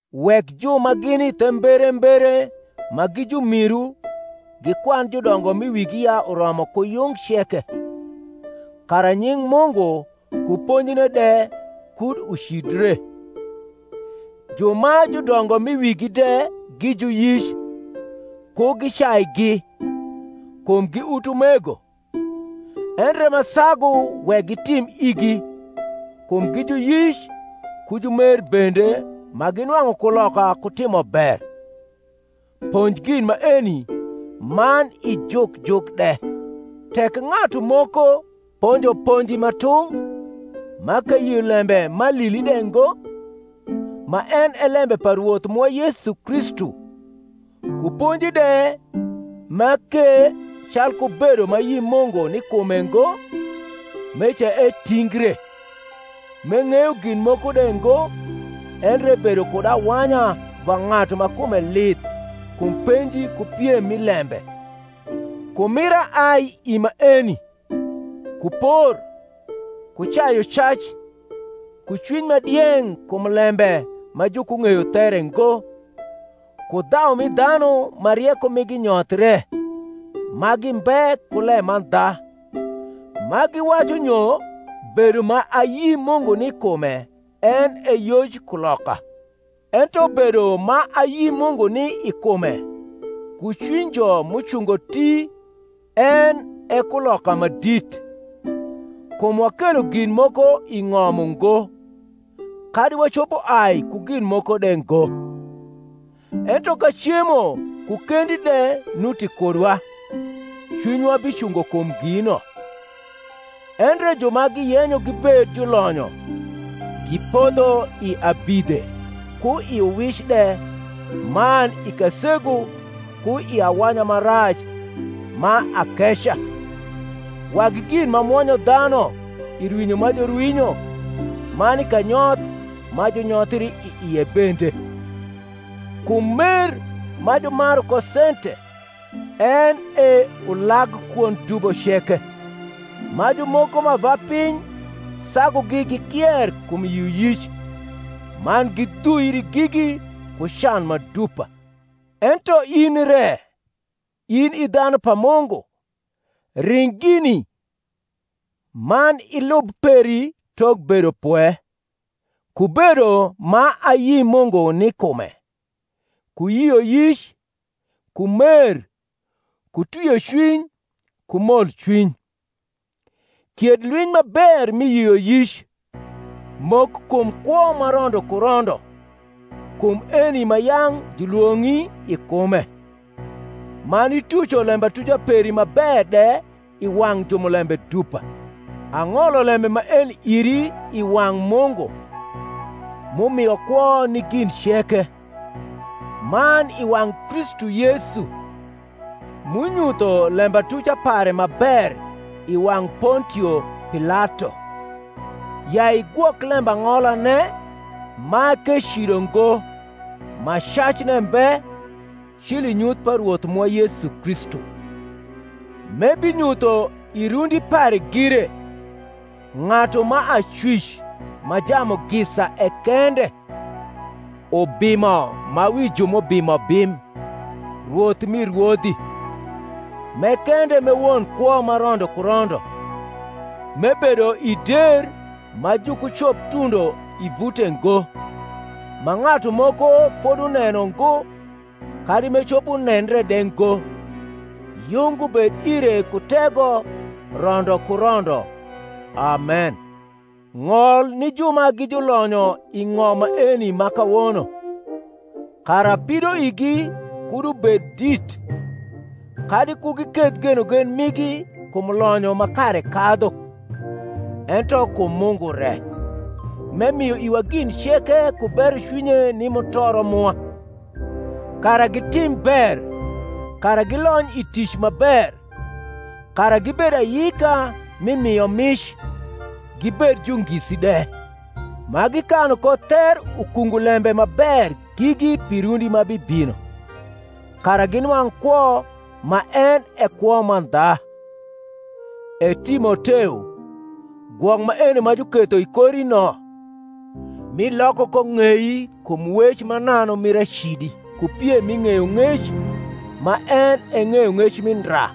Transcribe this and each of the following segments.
Wek ju ma gini the mberembere ma gi jumiru gikwan judongo m’i wigi ya uromo ku yung ceke, kara nying Mungu ku ponjine de kud ucidre. Ju ma judongo m’i wigi de gi juyic, ku gicaigi, kum gi utumego; endre ma sagu wek gitim igi, kum gi juyic ku jumer bende ma ginwang’u kuloka ku timo ber. Ponj gin maeni man ijuk juk de. Tek ng’atu moko ponjo ponji ma tung’, ma k’eyio lembe ma alili de ngo, ma en e lembe pa Rwoth mwa Yesu Kristu, ku ponji de ma k’e calku bedo ma ayi Mungu ni kume ngo; meca etingre, m’eng’eyo gin moko de ngo, endre ebedo kud awanya va ng’atu ma kume lith kum penji ku piem mi lembe, kumira ai i maeni, ku por, ku cayucac, ku cwiny ma dieng’ kum lembe ma jukung’eyo there ngo, ku dhau mi dhanu ma rieko migi nyothie ma gimbe ku lemandha, ma giwacu nyo bedo ma ayi Mungu ni kume en e yoj kuloka. Ento bedo ma ayi Mungu ni i kume ku cwinyjo m’ucungo ti en e kuloka ma dit: kum wakelo gin moko i ng’om ungo, kadi wacopo ai ku gin moko de ngo; ento ka cemo ku kendi de nuti kudwa cwinywa bicungo kum gino. Endre ju ma giyenyo gibed julonyo gipodho i abidhe ku i uwic de man i kasegu ku i awanya ma rac ma akeca, wagi gin ma mwonyo dhanu i rwinyo ma jurwinyo man i kanyoth ma junyothri i ie bende. Kum mer ma jumaru ko sente en e ulag kwond dubo ceke: ma jumoko ma ava piny sagugi gikier kum yioyic, man gidhuiri gigi ku can ma dupa. Ento in re, in i dhanu pa Mungu, ring gini; man ilub peri tok bedopwe, ku bedo ma ayi Mungu ni kume, ku yioyic, ku mer, ku twiocwiny, ku molcwiny. Kied lwiny ma ber mi yioyic, mok kum kwo ma rondo ku rondo, kum eni ma yang’ julwong’i i kume, man ituco lembatuca peri ma ber de i wang’ jumulembe dupa. Ang’olo lembe maeni iri i wang’ Mungu, m’umio kwo ni gin ceke, man i wang’ Kristu Yesu, m’unyutho lembatuca pare ma ber i wang’ Pontio Pilato; ya igwok lembang’olane, ma k’ecido ngo, ma cacne mbe, cil i nyuth pa Rwoth mwa Yesu Kristu: m’ebinyutho i rundi pare gire, ng’atu ma Acwic ma Jamugisa e kende, Ubimo ma wi ju m’ubimo bim, Rwoth mi rwodhi; m’e kende m’e won kwo ma rondo ku rondo, m’ebedo i der ma jukucoptundo i vute ngo; ma ng’atu moko foduneno ngo, kadi m’ecopo nendre de ngo: yung ubed ire ku tego rondo ku rondo. Amen. Ng’ol ni ju ma gi julonyo i ng’om maeni ma kawono, kara pidoigi kud ubed dit, kadi ku giketh genogen migi kum lonyo ma kare kadhu, ento kum Mungu re, m’emio iwa gin ceke ku berocwinye ni mutoro mwa; kara gitim ber, kara gilony i tic ma ber, kara gibed ayika mi miomic, gibed jungisi de; ma gikanu ko ther ukungu lembe ma ber gigi pi rundi ma bibino, kara ginwang’ kwo ma en e kwo mandha. E Timoteo, gwok maeno ma juketho i kori no, m’iloko ko ng’ei kum wec mananu mir acidi ku piem mi ng’eyong’ec ma en e ng’eyong’ec mi ndra;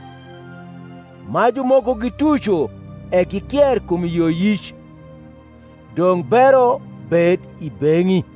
ma jumoko gituco e gikier kum yioyic. Dong’ bero bed i beng’i.